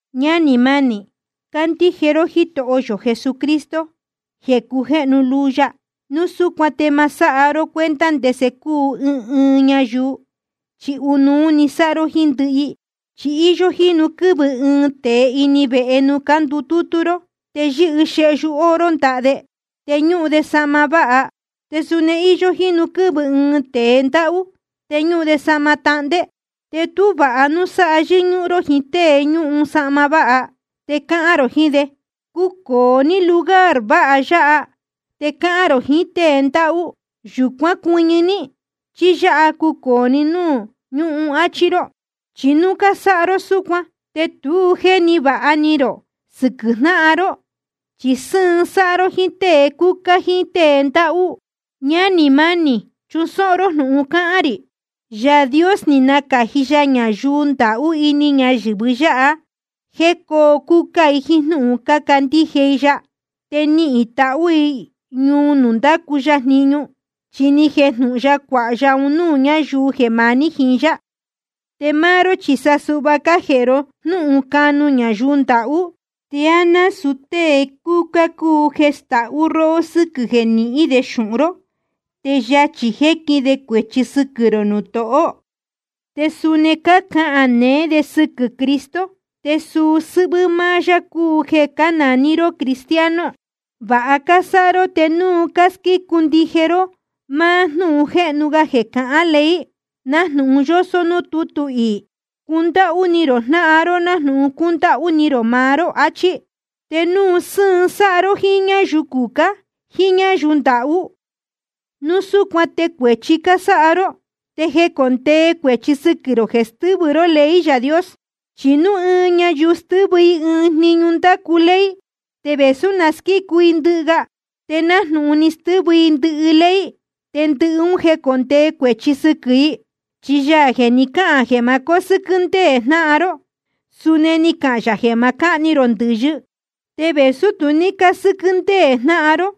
Ñánī mánī, cácandíje ró Jítoho yō Jesucristo jeē cujéhnu luu ya. Núu súcuan te ma sáha ró cuenta ndese cúu ɨɨn ɨɨn ñayuu, chi ɨnuú sáha ró jíín ndɨhɨ i. Chi íyó jínu quɨ́vɨ ɨɨn tēe ini vehe nuū cándutútú ró, te yɨ́hɨ xehyu oro ndaha de, te ñúhun de sahma váha. Te suni íyó jínu quɨ́vɨ ɨɨn tēe ndáhú, te ñúhun de sahma tahndé. Te tú vāha núu sáha yɨ́ñúhún ró jíín tée ñúhun sahma váha, te cahān rō jiín de: Cucōo ní lugar váha yāhá. Te cahān rō jiín tée ndáhú: Yūcuán cuɨñɨ ní, chí yáha cucōo ní nuū ñúhun, achi rō. Chi núu cásáha ró súcuan, te tu jéni vāha ni rō sɨquɨ̄ jnáhan ró, chi sɨ́ɨn sáha ró jíín tée cúcá jíín tée ndáhú. Ñánī mánī, chusóhó ró jnūhun cáhán rī: Yaā Dios ni nacāji ya ñayuu ndahú ini ñayɨ̄vɨ yáha jéē cóo cúcá i jíín jnúhun cácandíje i ya, te nihīn i tahū i ñuu nuū ndácu ya jniñu. Chi ni jejnūhun ya cuāha ya un núū ñáyuu jeē maní jiín yá. Te máá ró chi sa suhva cájēhe ró jnúhun canu ñayuu ndahú. ¿Te á násūu tée cúcá cúu jeē castáhú róhó sɨ́quɨ̄ jeē nihín de xūhun ró, te yachī jéquin de cuēchi sɨquɨ̄ rō nuū tohó? Te suni cácahān neé de sɨquɨ̄ Cristo, te suu sɨ́hvɨ́ máá yá cúu jeē cánaní ró cristiano. Vāha cásáha ró te núu cásquícu ndije ró máá jnúhun jéhnu ga jeē cahán ley, nájnūhun yósó núū tútu iī: Cundáhú ni rō jnáhan ró nájnūhun cúndáhú ni rō maá ró, achí. Te núu sɨ́ɨn sáha ró jíín ñáyuu cucá jíín ñáyuu ndahú, núu súcuan te cuēchi cásáha ró, te jécondee cuēchi sɨquɨ̄ rō jeē stɨ́vɨ ró ley Yaā Dios. Chi núu ɨɨn ñayuu stɨ́vɨ i ɨɨn‑ni jniñu ndácu ley, te vēsú na squícu i ndɨhɨ ga, te nájnūhun ni stɨ́vɨ i ndɨhɨ ley, te ndɨhɨ un jécondee cuēchi sɨquɨ̄ i. Chi Yaā jeē ni cáhān jeē ma cósɨ́quɨ́ ndéē jnáhan ró, suni ni cahān yā jeē ma cáhni rō ndɨ̄yɨ. Te vēsú tu ní cásɨ́quɨ́ ndéē jnáhan ró,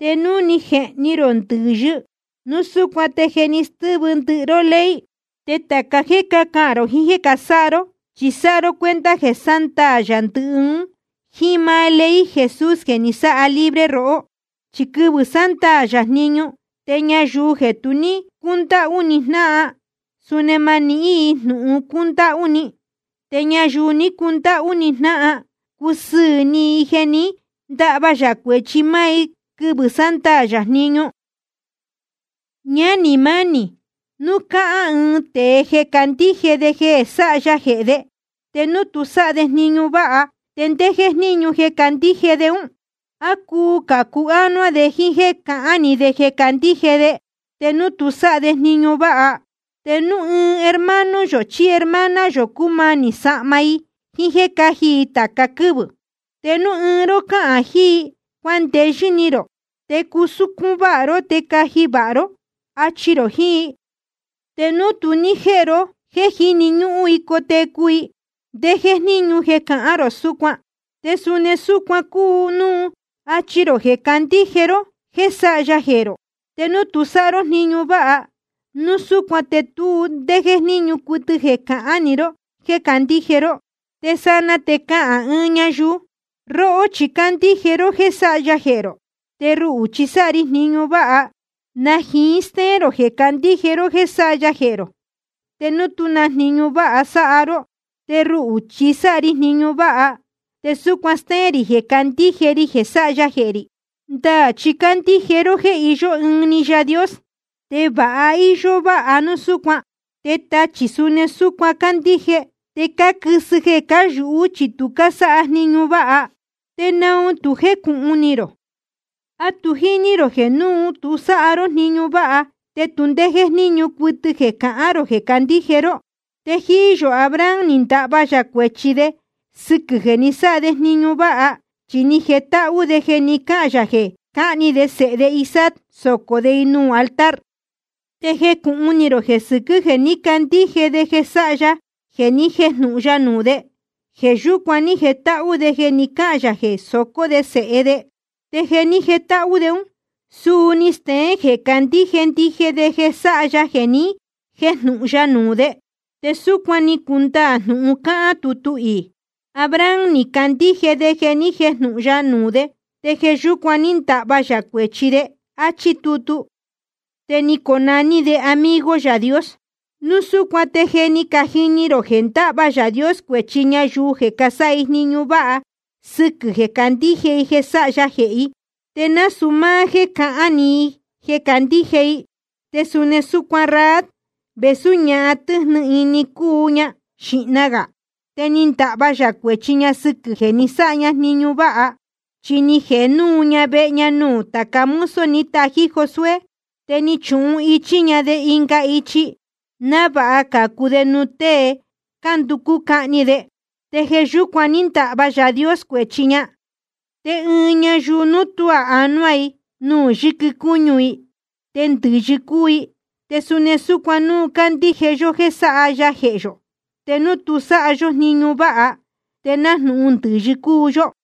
te núu ni jehni rō ndɨ̄yɨ, núu súcuan te je ni stɨ́vɨ ndɨhɨ ró ley. Te tāca jéē cahán rō jiín jéē sáha ró, chi sáha ró cuenta jeē sándaā yā ndɨhɨ un jíín máá ley Jesús jeē ni sáha libre rohó. Chi quɨvɨ̄ sándaā yā jniñu, te ñayuu jeē tu ní cúndáhú ni jnáhan, suni ma nihín i jnūhun cúndáhú ni. Te ñayuu ni cundáhú ni jnáhan, cusɨɨ̄ ni i jeē ní ndahva yā cuēchi i máá quɨ́vɨ̄ sándaā yā jniñu. Ñánī mánī, núu cáhán ɨɨn tēe jeē candíje de jeē sáha ya jehē de, te núu tu sáha de jniñu váha, ¿te ndé jéjníñu jeē candíje de ún? ¿A cuu cācu ánuá de jíín jéē cahán‑ni de jeē candíje de, te núu tu sáha de jniñu váha? Te núu ɨɨn hermano yō chí hermana yō, cúmanī sahma i jíín jéē cáji i tāca quɨ́vɨ̄, te núu ɨɨn ró cáhán jiín i: Cuandeyɨ́ ni rō, te cusúcún váha ró te caji vāha ró, achi rō jiín i, te núu tu ní jéhe ro jéē jíni ñúhún i cotecu i, ¿te ndé jéjníñu jeē cahán rō súcuan? Te suni súcuan cúu jeē núu áchí ró jeē candíje ró jeē sáha ya jehē rō, te núu tu sáha ró jniñu váha, núu súcuan te tu ndé jéjníñu cuɨtɨ jeē cahán‑ni ró jéē candíje ró. Te sanaa te cahān ɨɨn ñayuu: Róhó chi cándíje ró jéē sáha ya jehē rō, te ruhū chi sáha ri jniñu váha. ¿Na jiín stéén rō jeē candíje ró jeē sáha ya jehē rō, te núu tú na jniñu váha sáha ró? Te ruhū chi sáha ri jniñu váha te súcuan stéén rī jeē candíje ri jeē sáha ya jehē rī. Ndaā chi cándíje ró jeē iyó ɨɨn‑ni Yaā Dios. Te va íyó váha núu súcuan. Te tachī chi suni súcuan cácandíje, te cáquɨ́sɨ i jeē cáyūhú, chi tu cásáha jniñu váha. ¿Te naun tu jécūhun ni rō? ¿A tu jíní rō jeē núu tu sáha ró jniñu váha, te tu ndé jéjníñu cuɨtɨ jeē cahán rō jeē candíje ró? Te jíí yō Abraham, ni ndahva yā cuēchi de sɨquɨ̄ jeē ni sáha de jniñu váha. Chi ni jetáhú de jeē ni cáhān yā jeē cahni de sēhe de Isaac socō de i nuū altar. Te jécūhun ni rō jeē sɨquɨ̄ jeē ní candíje de jeē sáha ya jeē ni jéjnūhun ya nuū de, jeē yúcuan ní jetáhú de jeē ni cáhān yā jeē socó de sēhe de. Te jeē ní jetáhú de, suu ni steén jeē candíje ndije de jeē sáha ya jeē ni jéjnūhun ya nuū de. Te súcuan ni cundaā jnūhun cáhán tutu iī: Abraham ni candíje de jeē ni jéjnūhun ya nuū de, te jeē yúcuan ní ndahva yā cuēchi de, áchí tutu. Te ni conaní de amigo Yaā Dios. Núu súcuan te je ni cajini rō jeē ndáhva Yaā Dios cuēchi ñayuu jeē casáha i jniñu váha sɨquɨ̄ jeē cácandíje i jeē sáha ya jehē i, te nasūu máá jéē cahán‑ni i jeē candíje i. Te suni súcuan Rahab, vēsú ñahan tɨ́jnɨ ni ni cuu ña xīhna gā, te ni ndahva yā cuēchi ña sɨquɨ̄ jeē ni sáha ña jniñu váha. Chi ni jēhe núu ña vehe nuū tāca mozo ni tají Josué, te ni chuhichí ña de ɨnga ichi, návāha cācu de nuū tée cánducú cahni de. Te jeē yúcuan ní ndahva Yaā Dios cuēchi ña. Te ɨɨn ñayuu núu tuá anuá i nuū yɨquɨ cúñu i, te ndɨ̄yɨ cúu i. Te suni súcuan núu cándíje yó jeē sáha ya jehē yō, te núu tu sáha yó jniñu váha, te nájnūhun ndɨ̄yɨ cúu yó.